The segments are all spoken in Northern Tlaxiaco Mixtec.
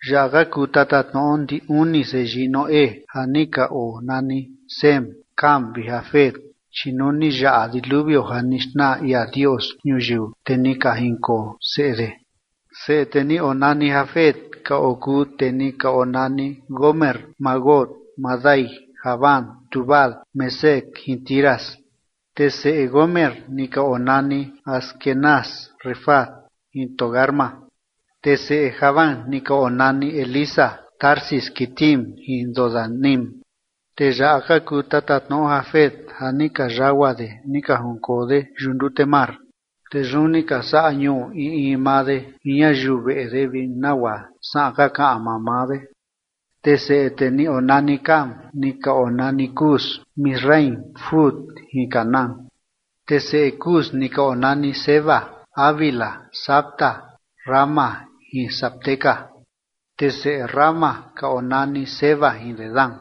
Yaꞌa ka kuu tatatnoꞌo ndi uni seyii Noé ja ni ka onani Sem, Cam vi Jafet, chi nuu ni yaꞌa diluvio ja ni xnaa ia Dios ñuyiu, te ni ka jinkoo seꞌe de. Seꞌe tee ni onani Jafet ka okuu tee ni ka onani Gomer, Magog, Madai, Javán, Tubal, Mesec jin Tiras. Te seꞌe Gomer ni ka onani Askenaz, Rifat jin Togarma. Te seꞌe Javán ni ka onani Elisa, Tarsis, Quitim jin Dodanim. Tee yaꞌa ka kuu tatatnoꞌo Jafet ja ni ka yagua de ni ka jinkoo de yuꞌu ndute mar, te yun ni ka saꞌa ñuu in in maa de jin ñayiu veꞌe de vi nagua saꞌan ka kaꞌan maa maa de. Te seꞌe tee ni onani Cam ni ka onani Cus, Misraim, Fut jin Canaán. Te seꞌe Cus ni ka onani Seba, Havila, Sabta, Raama, jin Sabteca. Te seꞌe Raama ka onani Seba jin Dedán.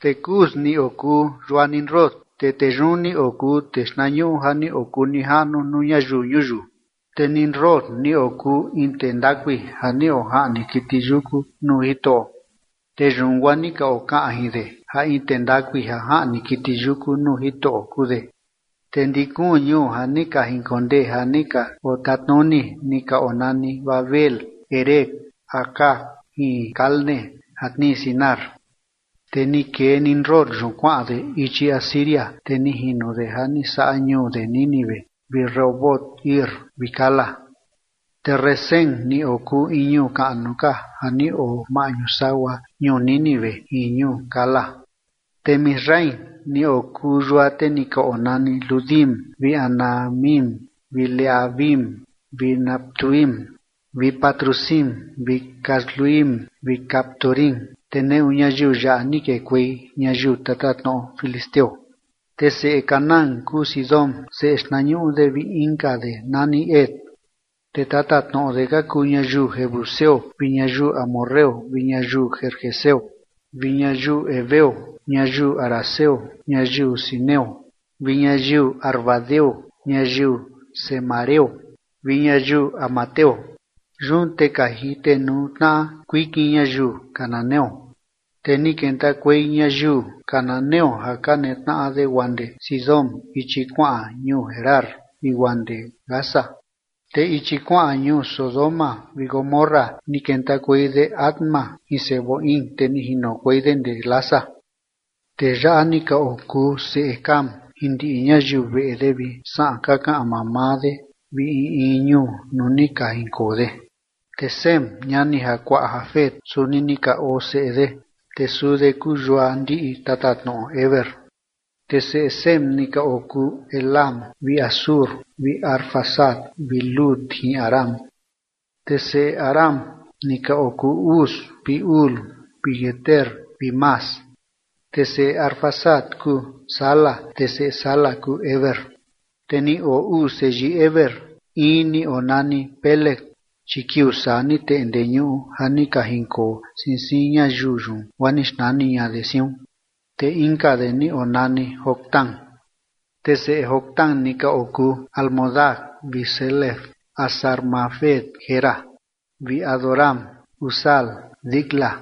Te Cus ni okuu yua Nimrod, te tee yun ni okuu tee xtnañuꞌu ja ni okuu nijaꞌnu nuu ñayiu ñuyiu. Te Nimrod ni okuu in tee ndakui ja ni ojaꞌni kiti yuku nuu Jitoꞌo, te yun guaa ni ka okaꞌan jin de ja in tee ndakui ja jaꞌni kiti yuku nuu Jitoꞌo kuu de. Te ndi kuun ñuu ja ni ka jinkondee ja ni ka otatnuni ni ka onani Babel, Erec, Acad jin Calne ja tnii Sinar. Te ni kee Nimrod yun kuaꞌan de ichi Asiria, te ni jino de ja ni saꞌa ñuu de Nínive vi Rehobot vi Cala. Te Resén ni okuu in ñuu kaꞌnu ka ja ni oo maꞌñu sagua ñuu Nínive jin ñuu Cala. Te Misraim ni okuu yua tee ni ka onani Ludim vi Anamim vi Lehabim vi Naftuhim vi Patrusim vi Casluhim vi Caftorim. Te neꞌu ñayiu yaꞌa ni kekuei ñayiu tatatnoꞌo filisteo. Te seꞌe Canaán kuu Sidón seꞌe xtnañuꞌu de vi inka de nani Het. Te tatatnoꞌo de ka kuu ñayiu jebuseo vi ñayiu amorreo vi ñayiu gergeseo vi ñayiu heveo, ñayiu araceo, ñayiu sineo vi ñayiu arvadeo, ñayiu zemareo vi ñayiu hamateo. Yun te ka jitenuu tnaꞌa kuikin ñayiu cananeo. Te ni kentakuei ñayiu cananeo ja ka netnaꞌa de guaa ndee Sidón ichi kuaꞌan ñuu Gerar vi guaa ndee Gaza, te ichi kuaꞌan ñuu Sodoma vi Gomorra, ni kentakuei de Adma jin Zeboim, te ni jinokuei de ndee Lasa. Tee yaꞌa ni ka okuu seꞌe Cam jin ndiꞌi ñayiu veꞌe de vi saꞌan ka kaꞌan maa maa de vi in in ñuu nuu ni ka jinkoo de. Te Sem, ñani jakuaꞌa Jafet, suni ni ka oo seꞌe de, te suu de kuu yua ndiꞌi tatatnoꞌo Heber. Te seꞌe Sem ni ka okuu Elam vi Asur vi Arfaxad vi Lud jin Aram. Te seꞌe Aram ni ka okuu Uz vi Hul vi Geter vi Mas. Te seꞌe Arfaxad kuu Sala, te seꞌe Sala kuu Heber. Te ni oo uu seyii Heber, in ni onani Peleg, chi kiuu saa ni teꞌnde ñuꞌu ja ni ka jinkoo siin siin ñayiu yun guaa ni xnani ña de siun, te inka de ni onani Joctán. Te seꞌe Joctán ni ka okuu Almodad vi Selef, Hazar-mavet, Jera, vi Adoram, Uzal, Dicla,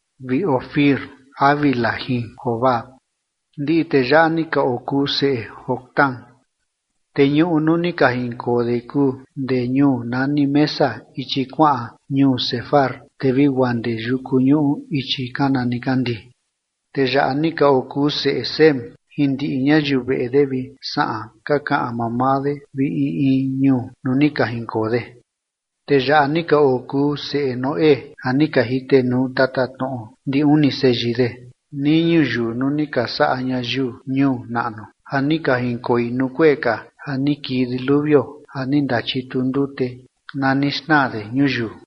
vi Ofir, Havila jin Jobab. Ndiꞌi tee yaꞌa ni ka okuu seꞌe Joctán. Te ñuꞌu nuu ni ka jinkoo de kuu ndee ñuu nani Mesa ichi kuaꞌan ñuu Sefar, te vi guaa ndee yuku ñuꞌu ichi kana nikandii. Tee yaꞌa ni ka okuu seꞌe Sem jin ndiꞌi ñayiu veꞌe de vi saꞌan ka kaꞌan maa maa de vi in in ñuu nuu ni ka jinkoo de. Tee yaꞌa ni ka okuu seꞌe Noé ja ni ka jitenuu tatatnoꞌo ndi uni seyii de nii ñuyiu nuu ni ka saꞌa ñayiu ñuu naꞌnu ja ni ka jinkoi nuu kuee ka ja ni kii diluvio ja ni ndachitu ndute na ni xnaa de ñuyiu.